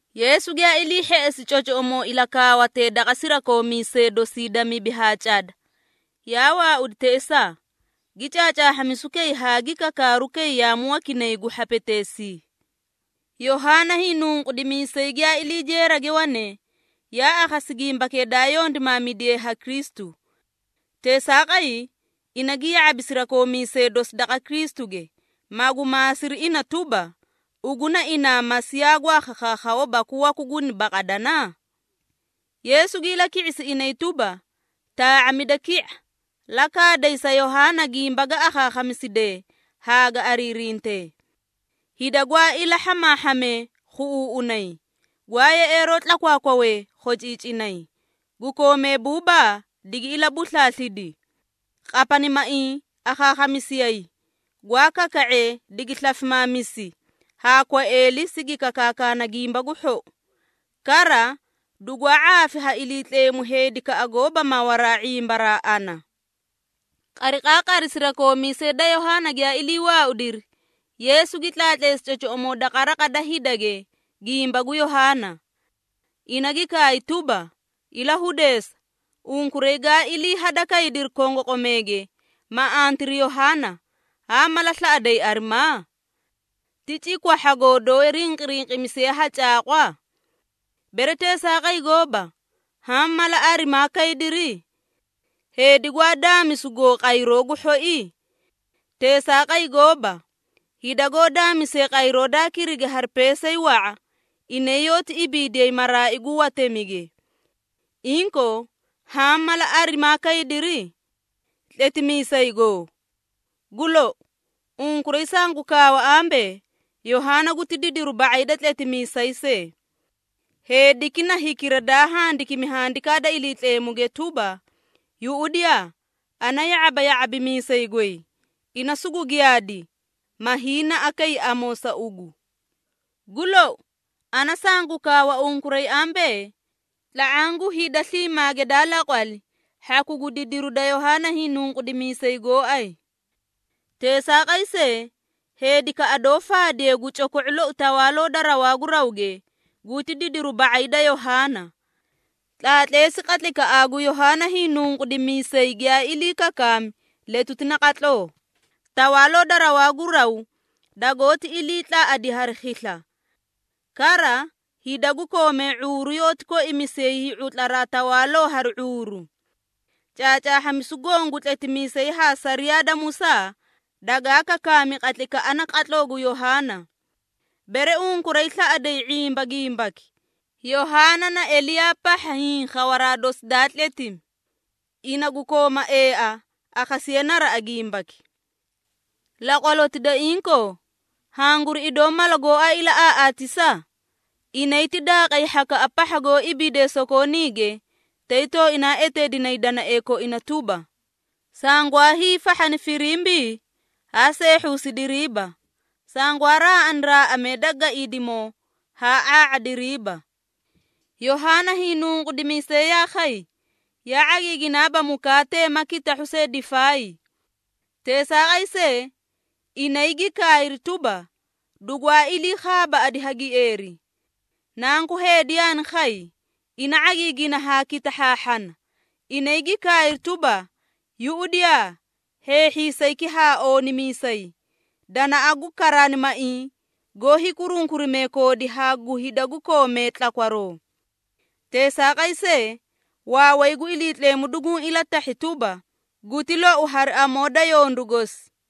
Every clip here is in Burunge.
Yeesu giyaa ilii hheꞌesi cocoꞌomoo ilakaawatee daqa sirakoomiisee dosi da mibi haa cada, yaa waaudi teꞌesaa, gi caacaahhamisu kay haa gi kakaaru kay yaamu wakinay gu hhapeteesii. Yohaana Hiinunqudimiisay giyaa ilii jeerage wane, yaa akhasi gimbakee daa yondimaamidiye ha Kristu. Teesaaqay, ina gi ya⁄abi sirakoomiisee dosi daqa Kristuge, magu maasiri ina tuba, “Ugu na inaa Masiiya gwaa khakhaakhawa baku waku guni baqadana?” Yeesu gi ilaki⁄isi inay tuba, “Taa⁄amida ki⁄a, la kaaday sa Yohaana gimba ga akhaakhamisidee haa ga ariirintee. Hida gwaa ilaa hhamaahhamee khuꞌuuꞌunay, gwaa yeꞌeeroo tlakwaakwawee khociicinay, gu koomee buubaa digi ilabuslaaslidi, qapanimaiĩ akhaakhamisiyayi, gwaa kaka⁄ee digi slafimaamisi haa kwaeeli sigi kakaakana Gimba gu Hhou. Kara dugwaa ⁄aafi ha Iliitleemu heedikaꞌa goóba mawaraa ⁄imbaraa ana.” Qariqaaqari sirakoomiisee da Yohaana giyaa ilii waaudiri, Yeesu gi tlaatleesi cocoꞌomoo daqa raqa da hidage gimba gu Yohaana. Ina gi kaay tuba, “Ilahudeesa, unkuray gaa ilii hada kaydiri kongoqomeege, ma antiri Yohaana, haa mala slaꞌaday arimaa? Ti cikwahhagoo doó rinqirinqimisiye ha caaqwa? Bere teesaaqay gooba, haã mala arimaa kaydiri? Heedi gwaa daamisugoo qayroo gu hhoii? Teesaaqay gooba, hida goó daamisee qayroo daa kirigi hari peesay wa⁄a, inay yoóti ibiidiyay maraai gu watemige! Inkoo, haã mala arimaa kaydiri? Tletimiisay goo? Gu lou! Unkuray sangu kaawa ambee, Yohaana guti didiru ba⁄ay da tletimiisay see. Heediki na hikira daa handikimi Handikaa da Iliitleemuge tuba, ‘Yuꞌudiyaa, ana ya⁄aba ya⁄abimiisay goy, ina sugu giyaadi, ma hiinaꞌa kay amoo sa ugu.’ Gu lou, ana sangu kaawa unkuray ambee, ‘Tla⁄aã gu hida sliimaage daa laqwali hhaku gu didiru da Yohaana Hiinunqudimiisay gooay. Teesaaqay see, heedikaꞌa doó faadiye gu coko⁄o loi Tawaaloo da rawaa gu rawge guti didiru ba⁄ay da Yohaana.’ Tlaatleesi qatlaykaꞌaa gu Yohaana Hiinunqudimiisay giyaa ilii kakaami letuti naqatloo, Tawaaloo da rawaa gu raw dagoóti ilii tlaꞌadi hari khisla. Kara, hida gu koomee ⁄uuru yoóti koimisiyay hii⁄utlaraa tawaalotee hari ⁄uuru. Caacaahhamisu goõ gu tletimiisee haa sariyaa da Musaa dagaa kakaami qatlaykaꞌa naqatloo gu Yohaana. Bere unkuray slaꞌaday ⁄imba gimbaki, Yohaana na Eliyaa pahha hiĩ khawaraa dosi daa tletimi. Ina gu kooma eaa, akhasiye naraꞌa gimbaki! Laqwaloti da inkoo, hanguri idoo mala gooay ilaꞌaaꞌaatisa? Inay ti daaqay hhakaꞌa pahha goó ibiidee sokooniige, tay tooinaa eteedinay danaee koina tuba, ‘Sangwaa hiifahhani firimbii, haa seehhusidiriiba! Sangwaa raaꞌani raaꞌamee da gaiidimoo, haa ⁄aa⁄adiriiba!’ Yohaana Hiinunqudimiisay yaa khay, yaa ⁄agiiginaaba mukaate ma kitahhu see difaay. Teesaaqay see, inay gi kaayri tuba, ‘Dugwaa ilii khaabaaꞌadi ha gieeri.’ Nanku Heedi yaani khay, ina ⁄agiigina haa kitahhaahhana, inay gi kaayri tuba, ‘Yuꞌudiyaa, hheehhiisayki haa oonimiisay, danaꞌa gu karaanimaiĩ goó hiikurunkurimee koodi haa gu hida gu koomee tlakwaroo!’ Teesaaqay see, waaway gu Iliitleemu duguũ ilatahhi tuba, guti lou hari amoo da yondu gosi.”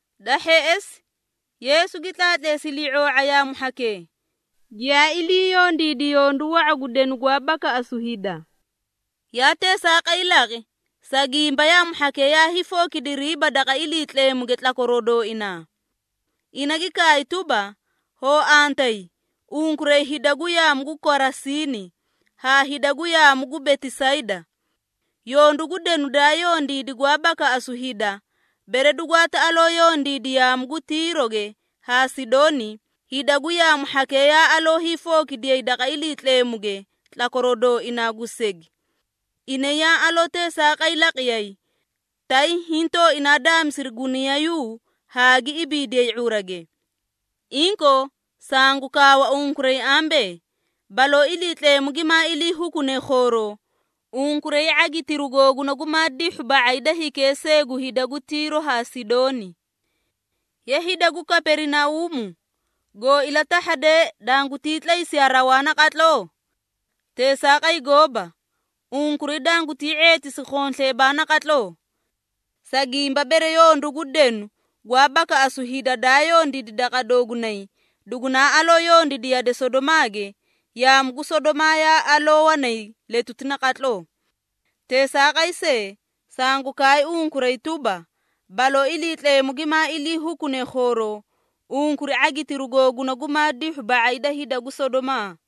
Da hheꞌesi, Yeesu gi tlaatleesi ilii⁄oo⁄a yaamu hhakee, giyaa ilii yondiidi yondu wa⁄a gu denu gwaa bakaꞌasu hida. Yaa teesaaqay laqi, sa gimba yaamu hhakee yaa hiifookidiriiba daqa Iliitleemuge tlakwaroo dooinaa. Ina gi kaay tuba, “Hoo antayi, unkuray hida gu yaamu gu Korasiini haa hida gu yaamu gu Betisayda! Yondu gu denu daa yondiidi gwaa bakaꞌasu hida, bere dugwaati aloo yondiida yaamu gu Tiiroge haa Sidooni, hida gu yaamu hhakee yaa aloo hiifookidiyay daqa Iliitleemuge tlakwaroo dooinaa gu segi. Inay yaa aloo teesaaqay laqiyay, tay hiĩ tooinaa daamisiri guniyayuu haa gi ibiidiyay ⁄urage. Inkoo, sangu kaawa unkuray ambee, baloo Iliitleemu gimaa ilii hukune khooroo, unkuray ⁄agitiru googuna gumaa dihhu ba⁄ay da hikee see gu hida gu Tiiro haa Sidooni. Ye, hida gu Kaperinauumu, goo ilatahhadee, dangutii tlaysiyaa raw naqatloo? Teesaaqay gooba! Unkuray dangutii ⁄eetisi khonsleebaa naqatloo. Sa gimba bere yondu gu denu gwaa bakaꞌasu hida, daa yondiidi daqa doogunay dugunaa aloo yondiidi yade Sodomaage, yaamu gu Sodomaa yaa aloo wanay letuti naqatloo. Teesaaqay see, sangu kaay unkuray tuba, baloo Iliitleemu gimaa ilii hukune khooroo, unkuray ⁄agitiru googuna gumaa dihhu ba⁄ay da hida gu Sodomaa!”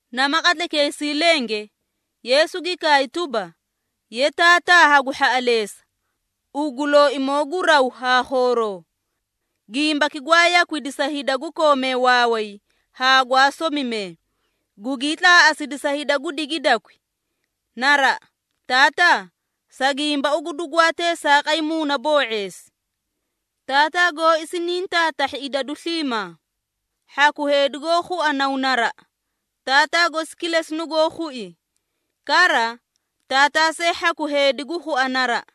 Nama qatlaykeesii lenge, Yeesu gi kaay tuba, “Ye, Taataa hagu hhaꞌaleesa, ugu Looimoo gu raw haa khooroo! Gimbaki gwaa yakwidi sa hida gu koomee waaway haa gwaa somimee, gugii tlaaꞌasidi sa hida gu digidakwi. Naraꞌa, Taataa, sa gimba ugu dugwaa teesaaqay muunaboo⁄eesi. Taataa gooi siniĩ taatahhi idadu sliimaa. Hhaku heedi goó khua Naw naraꞌa, Taataa gosi kilesi nugoó khui. Kara, Taataa see hhaku heedi gu khua naraꞌa,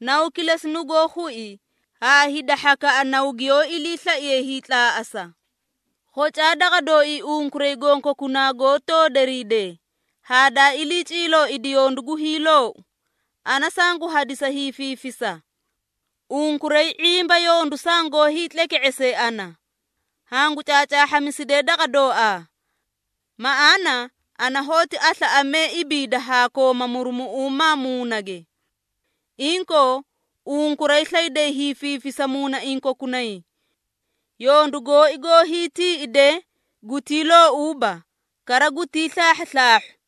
Naw kilesi nugoó khui haa hida hhakaꞌa Naw giyoo iliislaiye hiitlaaꞌasa. Khocaa daqa dooii unkuray gonkokunaa goó toodoriidee haa daa ilii ciilooidi yondu gu hiiloou, ana sangu hadisa hiifiifisa. Unkuray ⁄imba yondu sangoó hiitleke⁄ese ana, hangu caacaahhamisidee daqa dooaa. Maꞌaana ana hoóti aslaaꞌamee ibiida haa kooma murumuꞌuuma muunage. Inkoo, unkuray slayday hiifiifisa muunaiĩ kokunay. Yondu gooi goó hiitiiꞌidee gutii loouuba, kara gutii slaahhuslaahhu.”